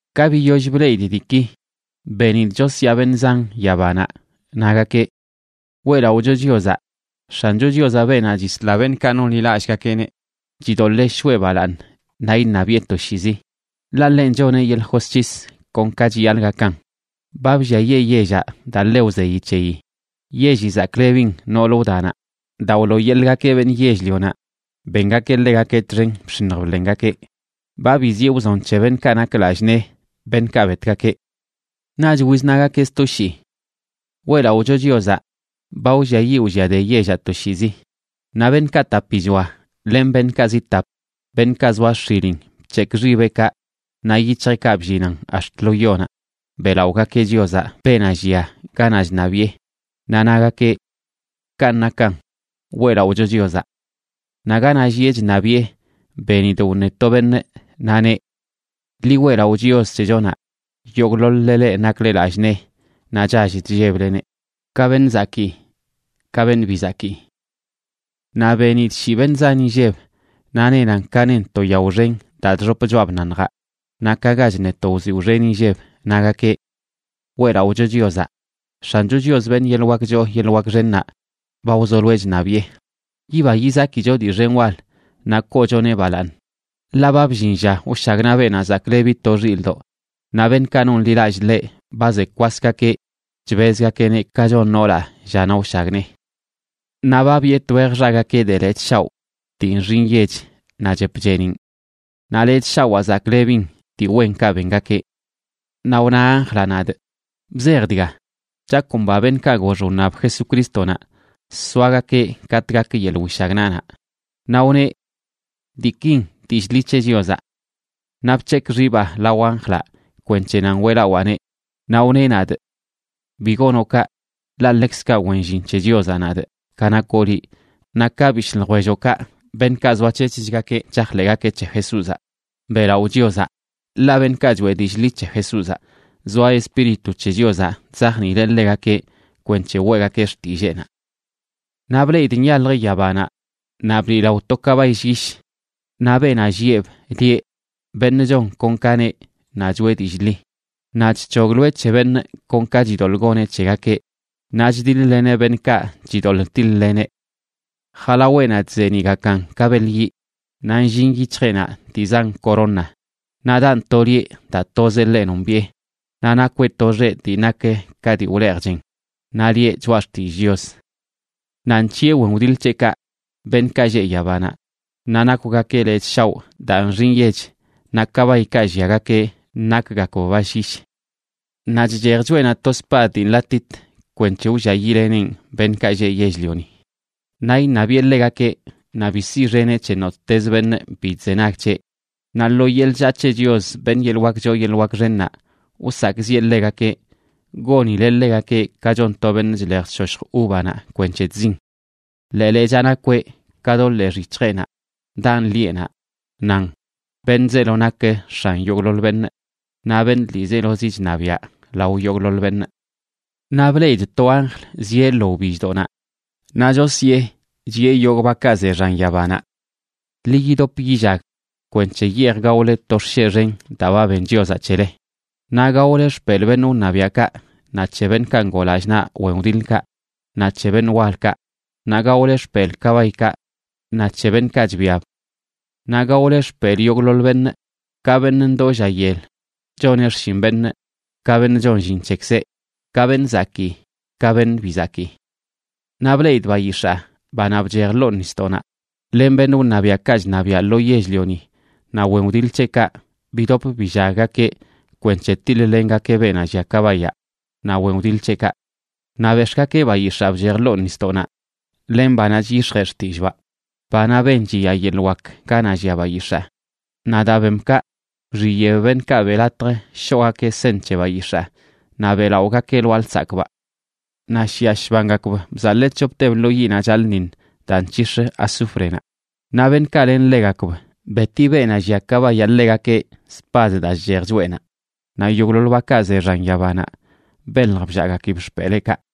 Ka biyoll bleꞌidꞌ diiki, benidꞌ chosyaa beṉꞌ zan yabanaꞌ, nagakeꞌ: ¡Weꞌlaꞌocho Chiozaꞌ! X̱ancho Chiozaꞌ, beenaꞌ chisla beṉꞌkaꞌ nonḻilallꞌgakeꞌneꞌ, chidoḻee shoꞌe balaaṉ naꞌ iṉabiꞌe toshiizi, ḻaꞌ ḻenꞌ choneꞌ yeḻꞌ josc̱his kon ka chiyaḻꞌ gakan. Ba blliayee yellaꞌ daa ḻe wzeyi c̱heyi. Yelli zaklebin nool wdanaꞌ daa wlooyeḻꞌgakeꞌ beṉꞌ yell-lionaꞌ bengakeꞌ ḻegakeꞌ txen bx̱iṉj bḻengakeꞌ. Ba biziꞌe wzon c̱he beṉꞌkaꞌ nak lallꞌ nee, beṉꞌkaꞌ betgakeꞌ. Naꞌch wiznagakeꞌ sto shii: ―¡Weꞌlaꞌocho Chiozaꞌ! Ba wlliayiꞌ wlliade yellaꞌ toshiizi. Naꞌ beṉꞌkaꞌ tapichoa len beṉꞌkaꞌ zi tap, beṉꞌkaꞌ zoa x̱ilin, bc̱hekꞌ xibeꞌkaꞌ naꞌ yic̱hjeꞌkaꞌ bllinan ax̱t lo yonaꞌ beꞌlaꞌogakeꞌ Chiozaꞌ, beenaꞌ llia ganaꞌ chṉabiꞌe. Naꞌ nagakeꞌ: ―Kanꞌ nakan. Weꞌlaꞌocho Chiozaꞌ. Naꞌ ganaꞌ llieꞌ chṉabiꞌe benidꞌ wṉe to beṉꞌ, naꞌ neꞌ: Ḻi weꞌlaꞌo Chios c̱hechonaꞌ, yogꞌḻoḻ-le leꞌ nakle lallꞌ nee naꞌ chall chllebleneꞌ, ka beṉꞌ zakii ka beṉꞌ bi zakii. Naꞌ benidꞌ shii beṉꞌ zan inlleb, naꞌ nenan ka nen to yao xen daa chxop choꞌa bnaṉjaꞌ naꞌ ka ga chṉe to wziwꞌ xen inlleb, nagakeꞌ: ¡Weꞌlaꞌocho Chiozaꞌ! X̱ancho Chios, beṉꞌ yeḻꞌ wak choo yeḻꞌ wak xennaꞌ, ba wzoloeꞌ chṉabiꞌe. Yiba yizakicho dii xen wal naꞌ koochoneꞌ balaaṉ. Ḻaꞌ ba bllin lla wshagnaꞌ Beenaꞌ Zaklebi to Xilꞌdoꞌ. Naꞌ beṉꞌkaꞌ nonḻilallꞌ ḻeꞌ ba ze kwasgakeꞌ chbezgakeꞌneꞌ ka chon noolaꞌ llanaꞌ wshagnee. Naꞌ ba biꞌe twej xagakeꞌ de lechꞌ shaoꞌ dii nxi nyech naꞌ chep cheeniꞌn. Naꞌ lechꞌ shawaa zaklebin dii wenkaꞌ bengakeꞌ. Naꞌ wna anjlaꞌ nadꞌ: ―Bzej dga: “Chakomba beṉꞌkaꞌ gox wṉab Jesucrístonaꞌ soagakeꞌ katꞌ gak yeḻꞌ wishagnaꞌnaꞌ.” Naꞌ wneꞌ: ―Diikin dillꞌ ḻi c̱he Chiozaꞌ. Naꞌ bc̱hekꞌ xibaa lao anjlaꞌ kwenc̱he nan weꞌlawaaneꞌ, naꞌ wneꞌ nadꞌ: ―¡Bi gonoꞌ kaꞌ! Ḻaꞌ ḻekzkaꞌ wen llin c̱he Chiozaꞌ nadꞌ, ka nakoꞌ liꞌ naꞌ ka bishꞌ ljwelloꞌkaꞌ, beṉꞌkaꞌ zoac̱hec̱hgakeꞌ chajḻeꞌgakeꞌ c̱he Jesúzaꞌ. ¡Beꞌlaꞌo Chiozaꞌ! Ḻaꞌ beṉꞌkaꞌ choeꞌ dillꞌ ḻi c̱he Jesúzaꞌ, zoa Espíritu c̱he Chiozaꞌ chzajniileꞌ ḻegakeꞌ kwenc̱he weꞌgakeꞌ xtilleenaꞌ. Naꞌ bleꞌidꞌ nyaljə yabanaꞌ naꞌ bliꞌlao to kabay llyish. Naꞌ beenaꞌ llieꞌb lieꞌ Beṉꞌ Chon Kon Ka Neꞌ naꞌ Choꞌe Dillꞌ Ḻi. Naꞌ chc̱hogloeꞌ c̱he beṉꞌ kon ka chidoḻꞌ goneꞌ c̱hegakeꞌ, naꞌ chdiḻ-leneꞌ beṉꞌkaꞌ chidoḻꞌ tiḻ-leneꞌ. Jalaweꞌnaꞌ chzeeniꞌgakan ka beḻ yiꞌ, naꞌ nllin yic̱hjeꞌnaꞌ dii zan corona. Naꞌ daꞌn to lieꞌ daa tozeꞌ ḻeꞌ nombiꞌe. Naꞌ nakweꞌ to xeꞌ dii nak ka dii wleej chen, naꞌ lieꞌ Choꞌa Xtillꞌ Chios. Naꞌ nc̱hiꞌe wen wdiḻ c̱heꞌkaꞌ, beṉꞌkaꞌ lleꞌ yabanaꞌ, naꞌ nakwgakeꞌ lechꞌ shaoꞌ daa nxi nyech, naꞌ kabaykaꞌ lliagakeꞌ nakgakb ba llyish. Naꞌ chchej choꞌenaꞌ to spad dii nḻatit kwenc̱he wlliayiꞌleneꞌn beṉꞌkaꞌ lleꞌ yell-lioni. Naꞌ iṉabiꞌe ḻegakeꞌ, naꞌ bi siꞌxeneꞌ c̱he nottez beṉꞌ bi chzenag c̱heꞌ. Naꞌ lo yeḻꞌ chllaa c̱he Chios, beṉꞌ yeḻꞌ wak choo yeḻꞌ wak xennaꞌ, wsakꞌziꞌe ḻegakeꞌ gonileꞌ ḻegakeꞌ ka chon to beṉꞌ chlej chshoshj uvanaꞌ kwenc̱he chzin. Ḻee lechaa nakweꞌ ka do ḻee xic̱hjeꞌnaꞌ daꞌn lieꞌnaꞌ, nan: “Beṉꞌ zeelo nak X̱an yogꞌḻoḻ beṉꞌ, naꞌ Beṉꞌ ḻiizelozi chṉabiaꞌ lao yogꞌḻoḻ beṉꞌ.” Naꞌ bleꞌidꞌ to anjl zieꞌ lo wbilldoꞌnaꞌ, naꞌ chosyee, chiꞌe yogꞌ bakaꞌ ze xan yabanaꞌ: ―Ḻi yidop yillag kwenc̱he yeej gaole to xsheꞌ xen daa ba ben Chiozaꞌ c̱hele. Naꞌ gaole xpelꞌ beṉꞌ wṉabiaꞌkaꞌ, naꞌ c̱he beṉꞌkaꞌ ngoo lallꞌ naꞌ wen wdiḻkaꞌ, naꞌ c̱he beṉꞌ walkaꞌ, naꞌ gaole xpelꞌ kabaykaꞌ naꞌ c̱he beṉꞌkaꞌ chbiab. Naꞌ gaole xpelꞌ yogꞌḻoḻ beṉꞌ, ka beṉꞌ ndoo lla yel choneꞌ xshin beṉꞌ ka beṉꞌ chon llin c̱hekzeꞌ, ka beṉꞌ zakii ka beṉꞌ bi zakii. Naꞌ bleꞌidꞌ bayix̱aa, banaꞌ bchej ḻoo nisdoꞌnaꞌ len beṉꞌ wṉabiaꞌkaꞌ chṉabiaꞌ lo yell-lioni naꞌ wen wdiḻ c̱heꞌkaꞌ bidop billaggakeꞌ kwenc̱he tiḻ-lengakeꞌ beenaꞌ llia kabayaꞌ naꞌ wen wdiḻ c̱heꞌkaꞌ. Naꞌ bex̱ꞌgakeꞌ bayix̱aa bchej ḻoo nisdoꞌnaꞌ len banaꞌ chyix̱jee xtillꞌbaꞌ, banaꞌ ben chiya yeḻꞌ wak ganaꞌ llia bayix̱aa. Naꞌ daa bem kaꞌ wxiyeꞌb beṉꞌkaꞌ beꞌ latj shoꞌgakeꞌ seṉ c̱he bayix̱aa naꞌ beꞌlaꞌogakeꞌ lwaa lsakꞌbaꞌ. Naꞌ shiꞌa shbangakb bzaḻee c̱hopteb lo yiꞌnaꞌ chaḻꞌṉiṉ daa nc̱hix̱ azúfrenaꞌ. Naꞌ beṉꞌkaꞌ len ḻegakb, beti beenaꞌ llia kabayaꞌ ḻegakeꞌ spad daa chchej choꞌenaꞌ, naꞌ yogꞌḻoḻ bakaꞌ ze xan yabanaꞌ belj bllaꞌgakib xpeleekaꞌ.